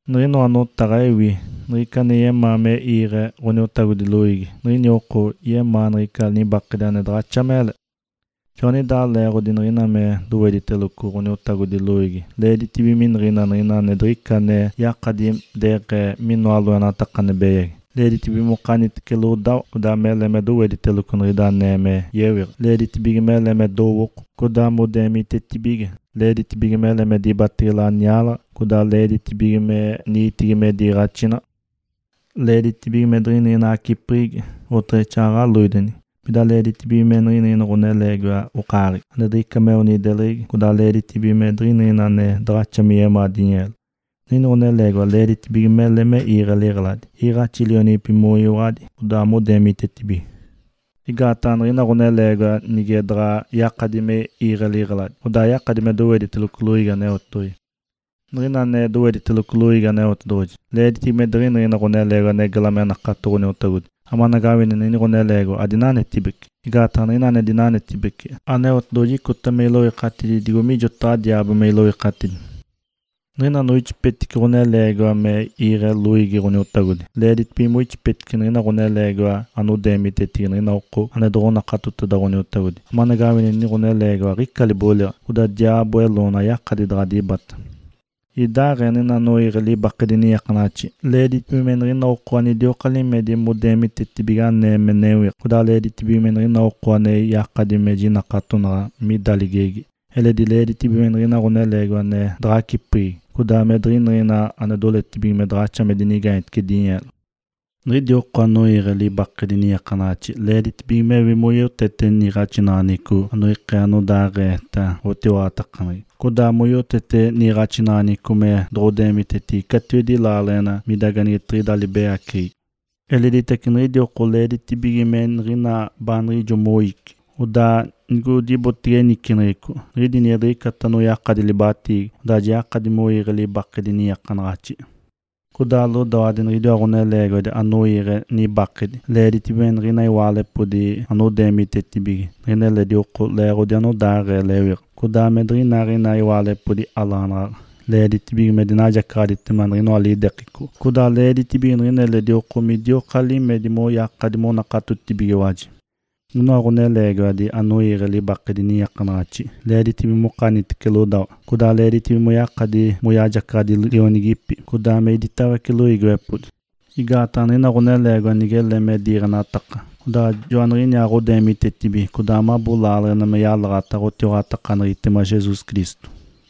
Niɡ̶inoa notaɡ̶a ewi. Nigica ane yemaa me iiɡ̶e Ǥoniotagodi loiigi, niɡ̶ini oko yemaa niɡ̶ica nibakedi ane daɡ̶axa mele. Joaniɡ̶idaa leeɡ̶odi niɡ̶ina ane dowediteloco Ǥoniotagodi loiigi leeditibige miniɡ̶ina niɡ̶ina ane diɡ̶ica ane yakadi deɡ̶ee minoa loenataka ane beyagi. Leeditibige mokanitece lodawa, codaa mele me dowediteloco niɡ̶ida anee me yewiɡ̶a, leeditibige mele me dowooko, codaa modeemitetibige. Leeditibige mele me dibatege laniaalaɡ̶a, codaa leeditibige me niitigi me diiɡ̶axinaɡ̶a. Leeditibige me diɡ̶iniɡ̶ina acipeɡ̶egi, oteɡ̶exaaɡ̶aɡ̶a loidenigi. Pida leeditibige me niɡ̶ina ɡ̶oneleegiwa okaaɡ̶egi, ane diɡ̶ica meo nideleɡ̶egi, codaa leeditibige me diɡ̶iniɡ̶ina ane daɡ̶axa me yemaa dinyeelo. Niɡ̶ini ɡ̶oneleegiwa leeditibige mele me iiɡ̶e liɡ̶eladi, iiɡ̶axi lionigipi moyiwaɡ̶adi, codaa modeemitetibige. Igaataɡ̶a niɡ̶ina ɡ̶oneleegiwa nige daɡ̶a yakadi me iiɡ̶e liɡ̶eladi, odaa ayakadi me dowediteloco loiigi Aneotedoɡ̶oji. Niɡ̶ina ane dowediteloco loiigi Aneotedoɡ̶oji, leeditibige me diɡ̶iniɡ̶ina ɡ̶oneleegiwa ane gela me nakato Ǥoniotagodi, amanagawini niɡ̶ini ɡ̶oneleegiwa adinanetibece. Igaataɡ̶a niɡ̶ina ane dinanetibece, Aneotedoɡ̶oji icota me iloikatidi digo mijotaɡ̶a diaabo me iloikatidi. Niɡ̶ina moixipetice ɡ̶oneleegiwa me iiɡ̶e loiigi Ǥoniotagodi, leeditibige moixipetice niɡ̶ina ɡ̶oneleegiwa anodeemitetibige niɡ̶ina oko ane doɡ̶onakatoteda Ǥoniotagodi, amanagawini niɡ̶ini ɡ̶oneleegiwa aɡ̶ica liboliɡ̶a, codaa diaabo eloona ayakadi daɡ̶a dibata. Idaaɡ̶ee niɡ̶ina anoiiɡ̶e libaketedi niiakanaɡ̶axi, leeditibige me niɡ̶ina oko anidioka limedi modeemitetibige anee me newiɡ̶a, codaa leeditibige me niɡ̶ina oko ane yakadi me jinakatonaɡ̶a mida ligegi. Eledi leeditibige me niɡ̶ina ɡ̶oneleegiwa ane daɡ̶acipeɡ̶egi, codaa me diɡ̶iniɡ̶ina anodoletibige me daɡ̶axa modinigaanyetece dinyeelo. Niɡ̶idi oko anoiiɡ̶e libaketedi niiakanaɡ̶axi leeditibige mewi moyotete niiɡ̶axinaɡ̶aneɡ̶eco anoikee anodaaɡ̶eeta ɡ̶otiwaɡ̶atakaneɡ̶egi, codaa moyotete niiɡ̶axinaɡ̶aneɡ̶eco me doɡ̶odeemitetece catiwedi laaleɡ̶ena mida anigetiɡ̶ida libeyaceɡ̶egi. Eleditace niɡ̶idi oko leeditibige me niɡ̶ina baaniɡ̶ijo moici. Odaa nigodibotege niciniɡ̶ico, nige diɡ̶icata anoyakaditece libatiigi, odaa ja yakadi moiiɡ̶e libaketedi niiakanaɡ̶axi. Codaa lodawadi niɡ̶idiwa ɡ̶oneleegiwadi anoiiɡ̶e nibakedi, leeditibige me niɡ̶ina iwaalepodi anodeemitetibige niɡ̶ina eledi oko leeɡ̶odi anodaaɡ̶ee lewiɡ̶a, codaa me diɡ̶iniɡ̶ina iwaalepodi alaɡ̶anaɡ̶aɡ̶a. Leeditibige me dinajacaɡ̶aditema niɡ̶inoa lidekeco, codaa leeditibige niɡ̶ina eledi oko midioka limedi moyakadi monakatotibigiwaji. Niɡ̶inoa ɡ̶oneleegiwadi anoiiɡ̶e libaketedi niiakanaɡ̶axi, leeditibige mokanitece lodawa, codaa leeditibige moyakadi moyajacaɡ̶adi lionigipi, codaa me iditawece loiigiwepodi. Igaataɡ̶a niɡ̶ina ɡ̶oneleegiwa nigele me diiɡ̶enataka, odaa joaniɡ̶iniaaɡ̶odeemitetibige, codaa mabo laaleɡ̶ena me yalaɡ̶ata ɡ̶otiwaɡ̶atakaneɡ̶egitema Jesus Cristo.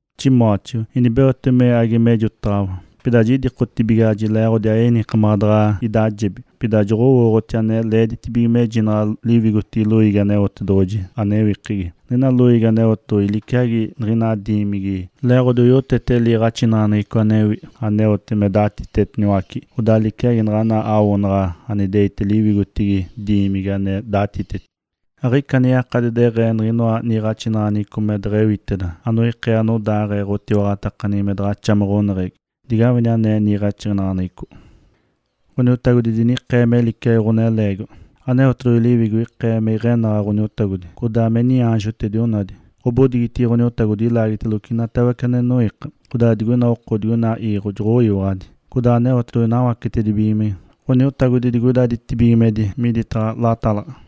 Timóteo, inibeotege me age mejotaɡ̶awa. Pida jidikotibigaɡ̶aji leeɡ̶odi ayenikamaɡ̶a daɡ̶a idajebi, pida joɡ̶owooɡ̶oti ane leeditibige mejinaɡ̶a liwigotigi loiigi Aneotedoɡ̶oji ewikegi. Niɡ̶ina loiigi Aneotedoɡ̶oji liciagi niɡ̶ina diimigi, leeɡ̶odi oyotete liiɡ̶axinaɡ̶aneɡ̶eco anewi, aneote me datitetiniwace, odaa liciagi naɡ̶ana awoonaɡ̶a aneitigi liwigotigi diimigi ane datiteti. Aɡ̶ica ane yakadi deɡ̶ee niɡ̶inoa niiɡ̶axinaɡ̶aneɡ̶eco me deɡ̶ewiteda anoikee anodaaɡ̶ee ɡ̶otiwaɡ̶atakaneɡ̶egi me daɡ̶axa me ɡ̶oneɡ̶egi. Digawini ane niiɡ̶axinaɡ̶aneɡ̶eco: Ǥoniotagodi dinikee me liciagi ɡ̶oneleegiwa. Aneotedoɡ̶oji Liwigo ikee me iɡ̶enaɡ̶a Ǥoniotagodi, codaa me niaanjotedi onadi. Ǥobodigitigi Ǥoniotagodi ilaagiteloco inatawece ane noiika, odaa niɡ̶ina oko digoina iiɡ̶o joɡ̶oyiwaɡ̶adi. Codaa Aneotedoɡ̶oji nawacetedibigimece Ǥoniotagodi digoida ditibigimedi miditaɡ̶a latalaɡ̶a.